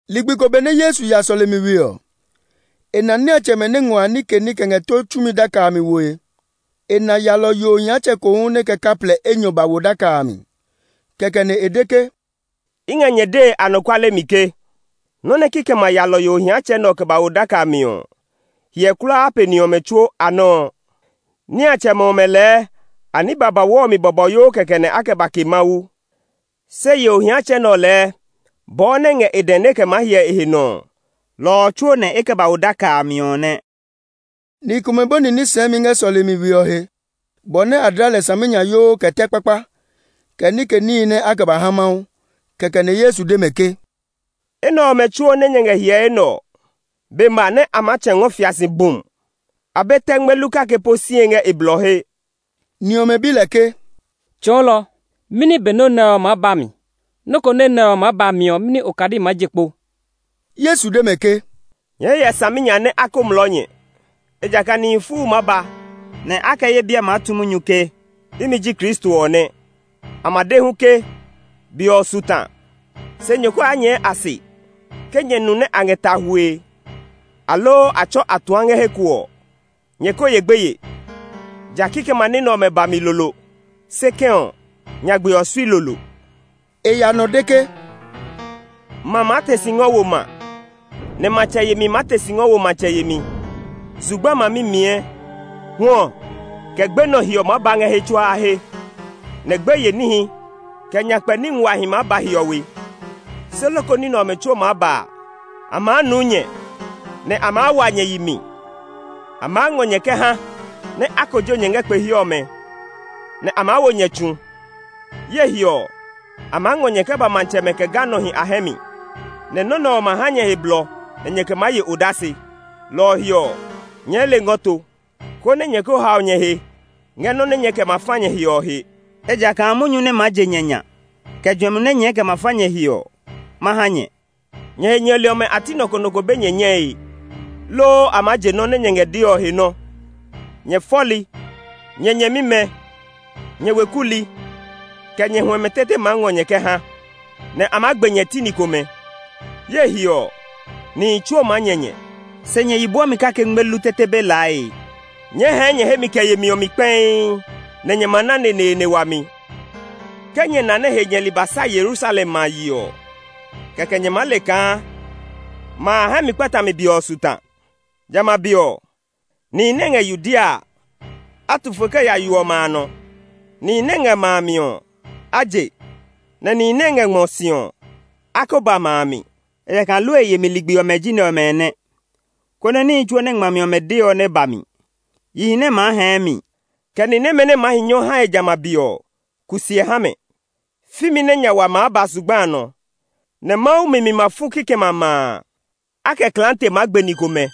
Ligbi ko benɛ Yesu ya sɔlemi we ɔ mi ɔ, e na niatsɛmɛ nɛ ngɔ a nike ní kɛ ngɛ tó tsumi daka a mi woe. E na yalɔyo ohiatsɛ ko hu nɛ kɛ kaplɛ enyɔ ba wo daka a mi. Kɛkɛ nɛ e de ke, “I ngɛ nyɛ dee anɔkuale mi ke, nɔ́ nɛ kikɛmɛ a yalɔyo ohiatsɛ nɛ ɔ kɛ ba wo daka a mi ɔ hiɛ kulaa pe ni ɔmɛ tsuo a nɔ́ ɔ. Niatsɛmɛ ɔmɛ lɛɛ a ní babauu ɔ mi bɔbɔyoo kɛkɛ nɛ a kɛ ba ke Mawu; se yo ohiatsɛ nɛ ɔ lɛɛ bɔɔ nɛ ngɛ e dɛ nɛ e kɛ maa hyɛ e he nɔ ɔ, lɔ ɔ tsuo nɛ e kɛ ba wo daka a mi ɔ nɛ.” Ni komɛ bɔni ní sɛɛmi ngɛ sɔlemi we ɔ he, bɔ nɛ a dla lɛ saminyayoo kɛ tɛ kpakpa, kɛ nike níhi nɛ a kɛ ba ha Mawu. Kɛkɛ nɛ Yesu de mɛ ke, “Enɛ ɔmɛ tsuo nɛ nyɛ ngɛ hyɛe nɛ ɔ, be ma nɛ a maa tsɛ̃ ngɔ fia si bum! A be tɛ ngmelu kake po sie ngɛ e blɔ he.” Ni ɔmɛ bi lɛ ke, “Tsɔɔlɔ, mɛni be nɔ́ nɛ ɔ maa ba mi? Loko nɔ́ nɛ ɔ maa ba mi ɔ, mɛni okadi maa je kpo?” Yesu de mɛ ke, “Nyɛɛ hyɛ saminya nɛ a ko mlɔɔ nyɛ, ejakaa nihi fuu maa ba, nɛ a kɛ ye biɛ maa tu munyu ke, ‘Imi ji Kristo ɔ nɛ!’ A ma de hu ke, ‘Be ɔ su ta!’ Se nyɛ ko ya nyɛɛ a se. Ke nyɛ nu nɛ a ngɛ ta hwue, aloo a tsɔ atuã ngɛ he ko ɔ, nyɛ ko ye gbeye; ja kikɛmɛ a ní nɛ ɔmɛ ba mi lolo. Se kɛ̃ ɔ, nyagbe ɔ sui lolo.” E ya nɔ de ke, “Ma maa te si ngɔ wo ma, nɛ matsɛ yemi maa te si ngɔ wo matsɛ yemi. Zugba ma mimiɛ; hwɔ, kɛ gbenɔ hiɔ maa ba ngɛ he tsuaa he; nɛ gbeye níhi, kɛ nyakpɛ ní nguahi maa ba hiɔwe. Se loko ní nɛ ɔmɛ tsuo maa ba a, a maa nuu nyɛ, nɛ a maa wa nyɛ yi mi. A maa ngɔ nyɛ kɛ ha nɛ a kojo nyɛ ngɛ kpe he ɔmɛ, nɛ a maa wo nyɛ tsu. Ye he ɔ, a maa ngɔ nyɛ kɛ ba matsɛmɛ, kɛ ganɔhi a hɛ mi. Nɛ nɔ́ nɛ ɔ ma ha nyɛ he blɔ nɛ nyɛɛ kɛ maa ye odase. Lɔ ɔ he ɔ, nyɛɛ le ngɔ to, konɛ nyɛ ko hao nyɛ he ngɛ nɔ́ nɛ nyɛɛ kɛ ma fa nyɛ he ɔ he. Ejakaa munyu nɛ maa je nyɛ nya, kɛ juɛmi nɛ nyɛɛ kɛ ma fa nyɛ he ɔ, ma ha nyɛ. Nyɛ he nyɛli ɔmɛ a ti nɔ ko nɔ ko be nyɛ nyɛe, loo a maa je nɔ́ nɛ nyɛ ngɛ dee ɔ he nɔ́. Nyɛ fɔli, nyɛ nyɛmimɛ, kɛ nyɛ weku li, nyɛ huɛmɛ tete maa ngɔ nyɛ kɛ ha, nɛ a maa gbe nyɛ ti ni komɛ. Ye he ɔ, nihi tsuo maa nyɛ nyɛ, se nyɛ yi bwɔmi kake ngmelu tete be laae. Nyɛɛ hɛɛ nyɛ hemi kɛ yemi ɔ mi kpɛii, nɛ nyɛ ma na neneene wami. “Ke nyɛ na nɛ he nyɛli ba sa Yerusalem ma a yi ɔ, kɛkɛ nyɛ maa le kaa ma a hɛ mi kpatami be ɔ su ta. Jamɛ a be ɔ, nihi nɛ ngɛ Yudea a, a tu fo kɛ ya yo ɔmɛ a nɔ; nihi nɛ ngɛ ma a mi ɔ, a je, nɛ nihi nɛ ngɛ ngmɔ si ɔ, a ko ba ma a mi. Ejakaa lue yemi ligbi ɔmɛ ji nɛ ɔmɛ nɛ; konɛ níhi tsuo nɛ ngmami ɔmɛ de ɔ nɛ ba mi. Yihi nɛ maa hɛɛ mi, kɛ ni nɛmɛ nɛ maa hi nyɔ hae jamɛ a be ɔ, kusiɛ ha mɛ! Fimi nɛ nya wa maa ba zugba a nɔ, nɛ Mawu mi mi ma fu kikɛmɛ a ma a. A kɛ klaate maa gbe ni komɛ.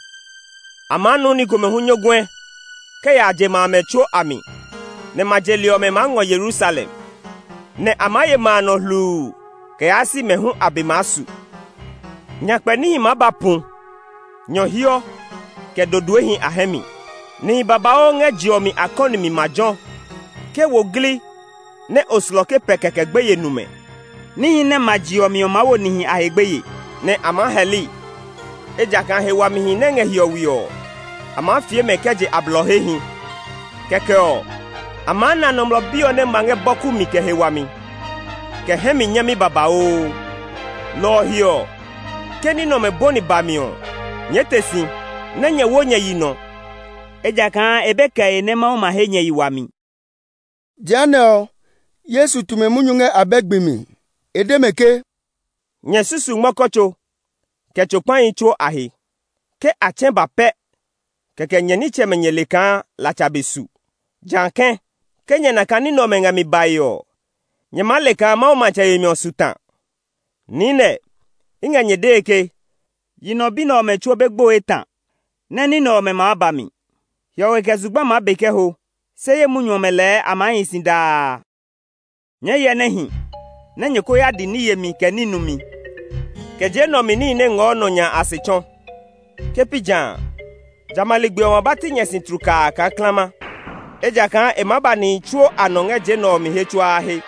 A maa nuu ni komɛ hu nyɔguɛ kɛ ya je ma amɛ tsuo a mi, nɛ ma je li ɔmɛ maa ngɔ Yerusalem, nɛ a maa ye ma a nɔ hluu kɛ yaa si mɛ hu a be maa su. “Nyakpɛ níhi maa ba pu, nyɔhiɔ, kɛ dodoehi a hɛ mi. Nihi babauu ngɛ je ɔ mi a kɔni mi ma jɔ̃; ke wo gli nɛ oslɔke pɛ kɛkɛ gbeye nu mɛ. Níhi nɛ ma je ɔ mi ɔ maa wo nihi a he gbeye, nɛ a maa hɛli, ejakaa he wamihi nɛ ngɛ hiɔwe ɔ, a maa fie mɛ kɛ je a blɔ hehi. Kɛkɛ ɔ, a maa na Nɔmlɔ Bi ɔ nɛ ma ngɛ bɔku mi, kɛ he wami, kɛ hɛ mi nyami babauu. Lɔ ɔ he ɔ, ke ní nɛ ɔmɛ bɔni mi bami ɔ, nyɛɛ te si, nɛ nyɛ wo nyɛ yi nɔ; ejakaa e be kɛe nɛ Mawu ma he nyɛ yi wami.” Jehanɛ ɔ, Yesu tu mɛ munyu ngɛ abɛ gbi mi. E de mɛ ke, “Nyɛ susu ngmɔkɔ tso, kɛ tso kpahi tsuo a he. Ke a tsɛ̃ ba pɛ kɛkɛ nyɛ nitsɛmɛ nyɛ le kaa latsa be su si ta. Jã kɛ̃, ke nyɛ na kaa ní nɛ ɔmɛ ngɛ mi bae ɔ, nyɛ maa le kaa Mawu matsɛ yemi ɔ su ta. “Niinɛ, i ngɛ nyɛ dee ke, yi nɔ bi nɛ ɔmɛ tsuo be gboe ta nɛ ní nɛ ɔmɛ maa ba mi. Hiɔwe kɛ zugba maa be kɛ ho, se ye munyu ɔmɛ lɛɛ a maa hi si daa. “Nyɛɛ hyɛ nɛ hi nɛ nyɛ ko ya di ní yemi, kɛ ní numi, kɛ je nɛ ɔ mi níhi nɛ ngɔɔ nɔ nya a a se tsɔ. Ke pi ja a, jamɛ a ligbi ɔ ma ba ti nyɛ si tlukaa kaa klama; ejakaa e maa ba nihi tsuo a nɔ ngɛ je nɛ ɔ mi he tsuaa he.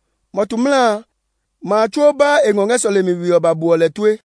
Mɔtu mla a, ma a tsuo baa e ngɔ ngɛ sɔlemi we ɔ ba buɔ lɛ tue.